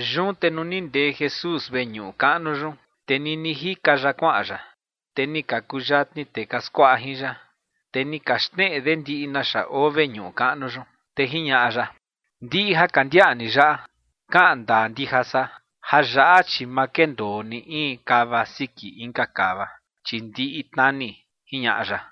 Yun te nuu ni ndee Jesús veñuꞌu kaꞌnu yun, te nini jika ya kuaꞌan ya, te ni ka kuyatni tee ka skuaꞌa jin ya. Te ni ka xneꞌe de ndiꞌi naxa oo veñuꞌu kaꞌnu yun. Te jiñaꞌa ya: ͏―͏Ndiꞌi ja ka ndiaꞌa ni yaꞌa, kaꞌan ndaa ndija san, jayaꞌa, chi ma kendoo ni in kava siki inka kava, chi ndiꞌi tnani ͏―͏jiñaꞌa ya.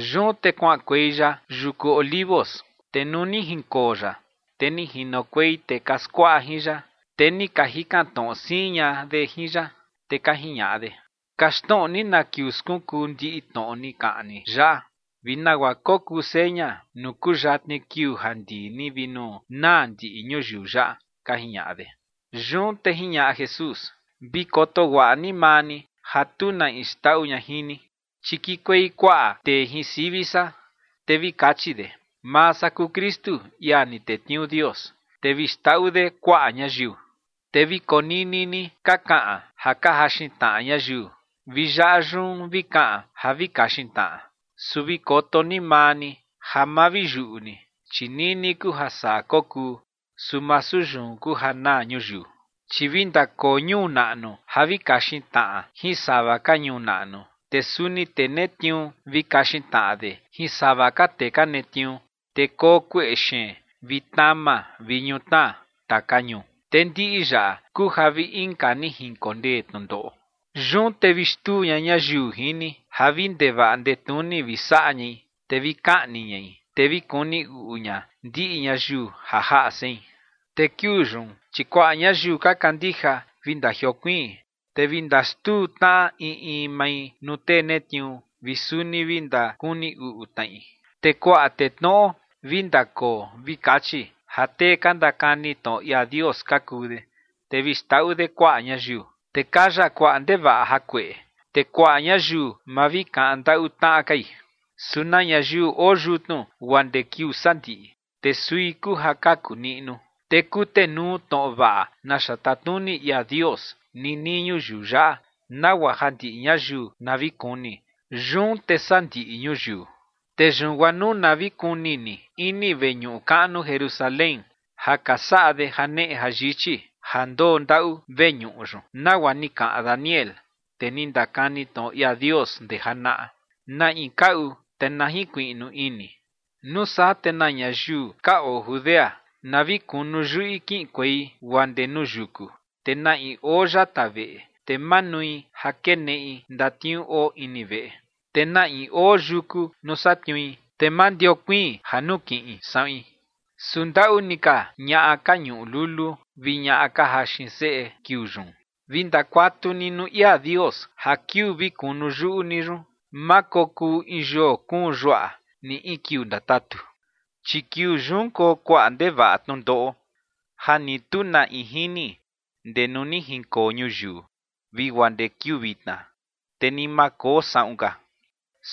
Yun te kuaꞌankuei ya yuku Olivos, te nuu ni jinkoo ya, te ni jinokuei tee ka skuaꞌa jin ya, te ni ka jikan tnoꞌo siin ña de jin ya, te ka jiñaꞌa de: ͏―͏Kaxtnoꞌo ni na kiuu skunkuu ndiꞌi tnoꞌo ni kaꞌan ni yaꞌa, vi nagua kokuu seña nuu kuyatni kiuu ja ndii ni vi nuu naa ndiꞌi ñuyiu yaꞌa ͏―͏ka jiñaꞌa de. Yun te jiñaꞌa Jesús: ͏―͏Vi koto guaꞌa ni maa ni ja tu na in xndaꞌu ña jin ni. Chi kikuei kuaꞌa tee jin sivi san, te vi kachi de: “Maa san kuu Kristu, ia ni tetniuu Dios”, te vi xndaꞌu de kuaꞌa ñayiu. Te vi konini ni ka kaꞌan ja ka jaxin tnaꞌa ñayiu, vi yaꞌa yun vi kaꞌan ja vi kaxin tnaꞌa. Su vi koto ni maa ni ja ma vi yuꞌu ni, chi nini kuu ja saa kokuu. Su masu yun kuu ja naa ñuyiu. Chi vi ndakoo ñuu naꞌnu ja vi kaxin tnaꞌa jin sava ka ñuu naꞌnu. Te suni tee netniuu vi kaxin tnaꞌa de jin sava ka tee ka netniuu. Te koo kueꞌe xeen vi tnama vi ñutnaa taka ñuu. Te ndiꞌi yaꞌa kuu ja vi inka ni jinkondee tnundoꞌo. ’Yun te vi xtuu ña ñayiu jin ni ja vi ndevaꞌa ndetnuni vi saꞌa ñai, te vi kaꞌni ñai, te vi kuni uꞌu ña ndiꞌi ñayiu ja jaꞌa sein. Te kiuu yun, chi kuaꞌa ñayiu ka kandija vi ndajiokuiin, te vi ndaxtuu tnaꞌa in in mai nuu tee netniuu, vi suni vi ndakuni uꞌu tnaꞌi. Te kuaꞌa tee tnoꞌo vi ndakoo vi kachi ja tee ka ndakani tnoꞌo ia Dios ka kuu de, te vi xndaꞌu de kuaꞌa ñayiu. Te kaya kuaꞌa ndevaꞌa jakueꞌe, te kuaꞌa ñayiu ma vi kaꞌan ndaꞌu tnaꞌa kai. Su na ñayiu oo yutnu guaa ndee kiuu sandiꞌi, te sui kuu ja kaku niꞌnu. Te kutenuu tnoꞌo vaꞌa naxa tatnuni ia Dios ninii ñuyiu yaꞌa, nagua ja ndiꞌi ñayiu na vi kuni, yun te saa ndiꞌi ñuyiu. ’Te yun guaa nuu na vi kuni ni ini veñuꞌu kaꞌnu Jerusalén ja ka saꞌa de janeꞌe jayichi ja ndoo ndaꞌu veñuꞌu yun nagua ni kaꞌan Daniel, tee ni ndakani tnoꞌo ia Dios ndee janaꞌa. Na in kaꞌu, te na jinkuiꞌnu ini. Nuu saa te na ñayiu ka oo Judea na vi kunu yuꞌi kiꞌinkuei guaa ndee nuu yuku. Te na in oo yata veꞌe, te ma nui ja keneꞌi ndatniuu oo ini veꞌe. Te na in oo yuku nuu satniui, te ma ndiokuiin ja nukiꞌin saꞌuin. Su ¡ndaꞌu ni ka ñaꞌa ka ñuꞌu lulu vi ñaꞌa ka jaxin seꞌe kiuu yun! Vi ndakuatu ni nuu ia Dios ja kiuu vi kunu yuꞌu ni yun, ma kokuu in yoo kuun yuaꞌa ni in kiuu ndatatu. Chi kiuu yun koo kuaꞌa ndevaꞌa tnundoꞌo ja ni tu na in jini ndee nuu ni jinkoo ñuyiu vi guaa ndee kiuu vitna, te ni ma koo saꞌun ka.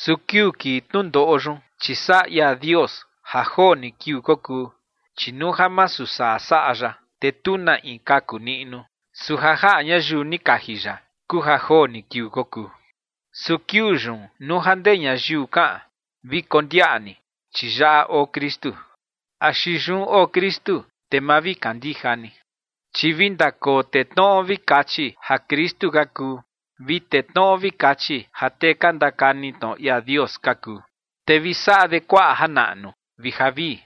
Su kiuu kii tnundoꞌo yun, chi saꞌa ia Dios ja joo ni kiuu kokuu, chi nuu ja masu saa saꞌa ya, te tu na in kaku niꞌnu. Su ja jaꞌa ñayiu ni kaji ya kuu ja joo ni kiuu kokuu. ’Su kiuu yun nuu ja ndee ñayiu kaꞌan: “Vi kondiaꞌa ni, chi yaꞌa oo Kristu”, axi “Yun oo Kristu”, te ma vi kandija ni. Chi vi ndakoo tee tnoꞌo vi kachi ja Kristu ka kuu, vi tee tnoꞌo vi kachi ja tee ka ndakani tnoꞌo ia Dios ka kuu, te vi saꞌa de kuaꞌa janaꞌnu vi javii,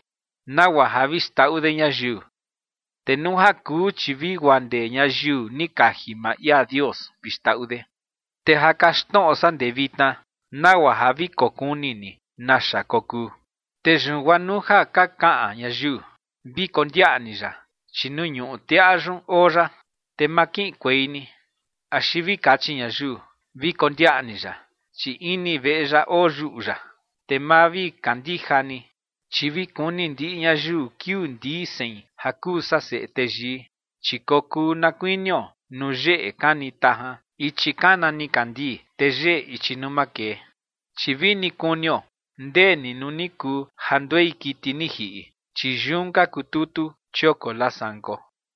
nagua ja vi xndaꞌu de ñayiu. Te nuu ja kuu, chi vi guaa ndee ñayiu ni kaji maa ia Dios vi xndaꞌu de. Te ja kaxtnoꞌo san ndee vitna nagua ja vi kokuni ni naxa kokuu. Te yun guaa nuu ja ka kaꞌan ñayiu: “Vi kondiaꞌa ni ya, chi nuu ñuꞌu teꞌa yun oo ya”, te ma kiꞌinkuei ni. Axi vi kachi ñayiu: “Vi kondiaꞌa ni ya, chi ini veꞌe ya oyuꞌu ya”, te ma vi kandija ni. Chi vi kuni ndiꞌi ñayiu kiuu ndii sein ja kuu san Seꞌe Teyii, chi kokuu na kuinio nuu yeꞌe kani tajan ichi kana nikandii, te yeꞌe ichi nuu makee. Chi vini kunio ndee ni nuu ni kuu ja nduei kiti ni jiꞌi, chi yun ka kututu chioko lasanko.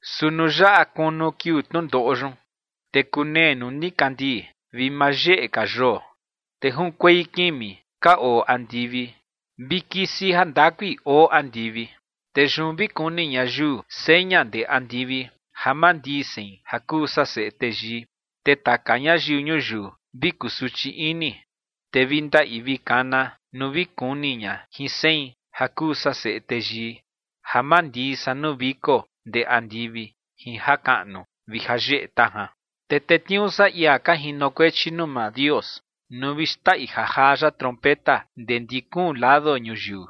’Su nuu yaꞌa kunu kiuu tnundoꞌo yun, te kunee nuu nikandii vi ma yeꞌe ka yoo, te junkuei kimi ka oo andivi vi kisi jandakui oo andivi. Te yun vi kuni ñayiu seña ndee andivi ja mandii sein ja kuu san Seꞌe Teyii. Te taka ñayiu ñuyiu vi kusuchi ini, te vi ndaꞌi vi kana nuu vi kuni ña jin sein ja kuu san Seꞌe Teyii, ja mandii san nuu viko ndee andivi jin jakaꞌnu vi jayeꞌe tajan. Te tetniuu san ia ka jinokuechi nuu maa Dios nuu vi xndaꞌi jajaa ya trompeta ndee ndi kuun lado ñuyiu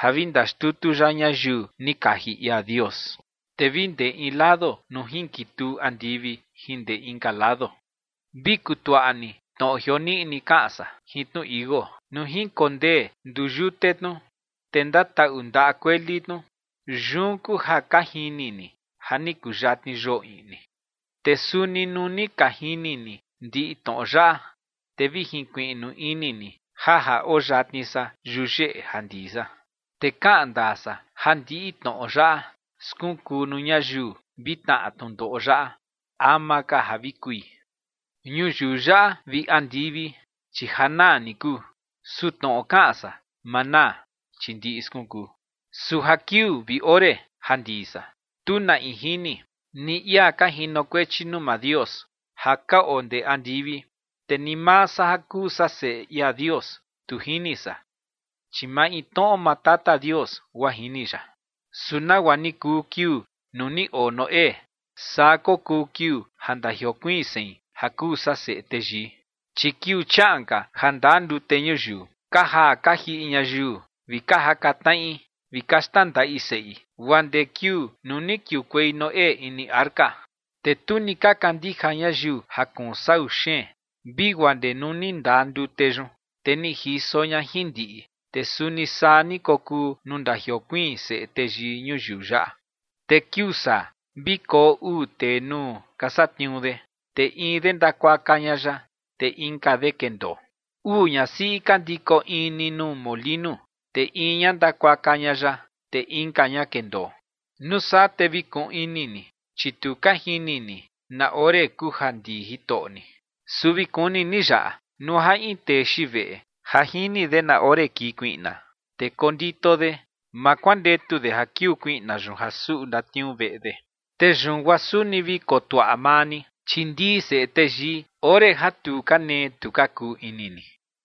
ja vi ndaxtutu ya ñayiu ni kaji ia Dios, te vi ndee in lado nuu jinkituu andivi jin ndee inka lado. ’Vi kutuaꞌa ni tnoꞌo jioniꞌi kaꞌan san jin tnu tichi iuu. Nuu jinkondee nduyute tnu, te ndataꞌu ndaꞌa kueli tnu, yun kuu ja ka jini ni ja ni kuyatni yoo iꞌni. Te suni nuu ni ka jini ni ndiꞌi tnoꞌo yaꞌa, te vi jinkuiꞌnu ini ni ja ja oo yatni san yuyeꞌe ja ndii san. Te kaꞌan ndaa san ja ndiꞌi tnoꞌo yaꞌa skunkuu nuu ñayiu vi tnaꞌa tnundoꞌo yaꞌa ama ka ja vi kui. Ñuyiu yaꞌa vi andivi, chi ja naa ni kuu. Su tnoꞌo kaꞌan san, ma naa, chi ndiꞌi skunkuu. ’Su ja kiuu vi ore ja ndii san, tu na in jini, ni ia ka jinokuechi nuu maa Dios ja ka oo ndee andivi, te ni maa san ja kuu san Seꞌe ia Dios, tu jini san, chi maintnoꞌo maa Tata Dios guaa jini ya. ’Su nagua ni kuu kiuu nuu ni oo Noé, saa kokuu kiuu ja ndajiokuiin sein ja kuu san Seꞌe Teyii. Chi kiuu chiaꞌan ka ja ndaa ndute ñuyiu, ka jaa ka jiꞌi ñayiu, vi ka jaka tnaꞌi vi ka xtnandaꞌi seꞌi guaa ndee kiuu nuu ni kiukuei Noé ini arca. Te tu ni ka kandija ñayiu ja kuun sau xeen vi guaa ndee nuu ni ndaa ndute yun, te ni jiso ña jin ndiꞌi. Te suni saa ni kokuu nuu ndajiokuiin Seꞌe Teyii ñuyiu yaꞌa. Te kiuu saa vi koo uu tee nuu ka satniuu de, te in de ndakuaka ña ya, te inka de kendoo. Uu ñasiꞌi ka ndiko in ni nuu molinu, te in ña ndakuaka ña ya, te inka ña kendoo. ’Nuu saa te vi kuꞌun ini ni, chi tu ka jini ni na ore kuu ja ndii Jitoꞌo ni. Su vi kuni ni yaꞌa, nuu ja in tee xiin veꞌe ja jini de na ore kii kuiꞌna, te kondito de, ma kuandetu de ja kiuu kuiꞌna yun ja suꞌu ndatniuu veꞌe de. Te yun guaa suni vi kotuaꞌa maa ni, chi ndii Seꞌe Teyii ore ja tu ka nee tu ka kuu ini ni.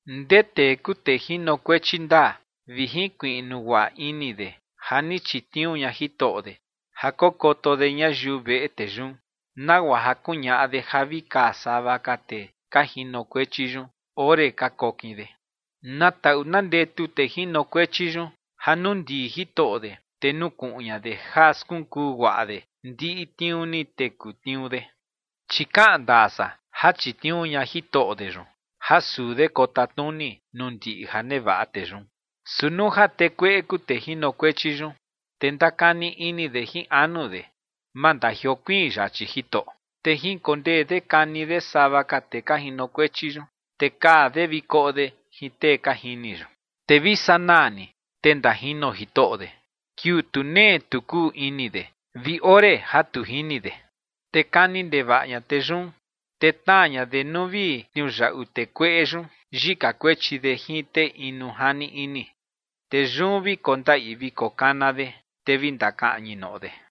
’¿Ndee tee kuu tee jinokuechi ndaa vi jinkuiꞌnu guaꞌa ini de ja ni chitniuu ña jitoꞌo de ja kokoto de ñayiu veꞌe tee yun, nagua ja kuñaꞌa de ja vi kaa sava ka tee ka jinokuechi yun ore ka kokin de? Na taꞌu na ndetu tee jinokuechi yun ja nuu ndii jitoꞌo de, te nukuꞌun ña de ja skunkuu guaꞌa de ndiꞌi tniuu ni teku tniuu de. Chi kaꞌan ndaa san ja chitniuu ña jitoꞌo de yun ja suu de kotatnuni nuu ndiꞌi ja nevaꞌa tee yun. Su nuu ja tee kueꞌe kuu tee jinokuechi yun, te ndakani ini de jin anu de: “Ma ndajiokuiin yachi jitoꞌo”, te jinkondee de kani de sava ka tee ka jinokuechi yun, te kaa de vi koꞌo de jin tee ka jini yun. Te vi sanaa ni, te ndajino jitoꞌo de kiuu tu nee tu kuu ini de vi ore ja tu jini de. Te kani ndevaꞌa ña tee yun, te tnaa ña de nuu vi tniuyaꞌu tee kueꞌe yun yika kuechi de jin tee inu jani ini. Te yun vi kondaꞌi vi kokana de, te vi ndakaꞌñi noꞌo de.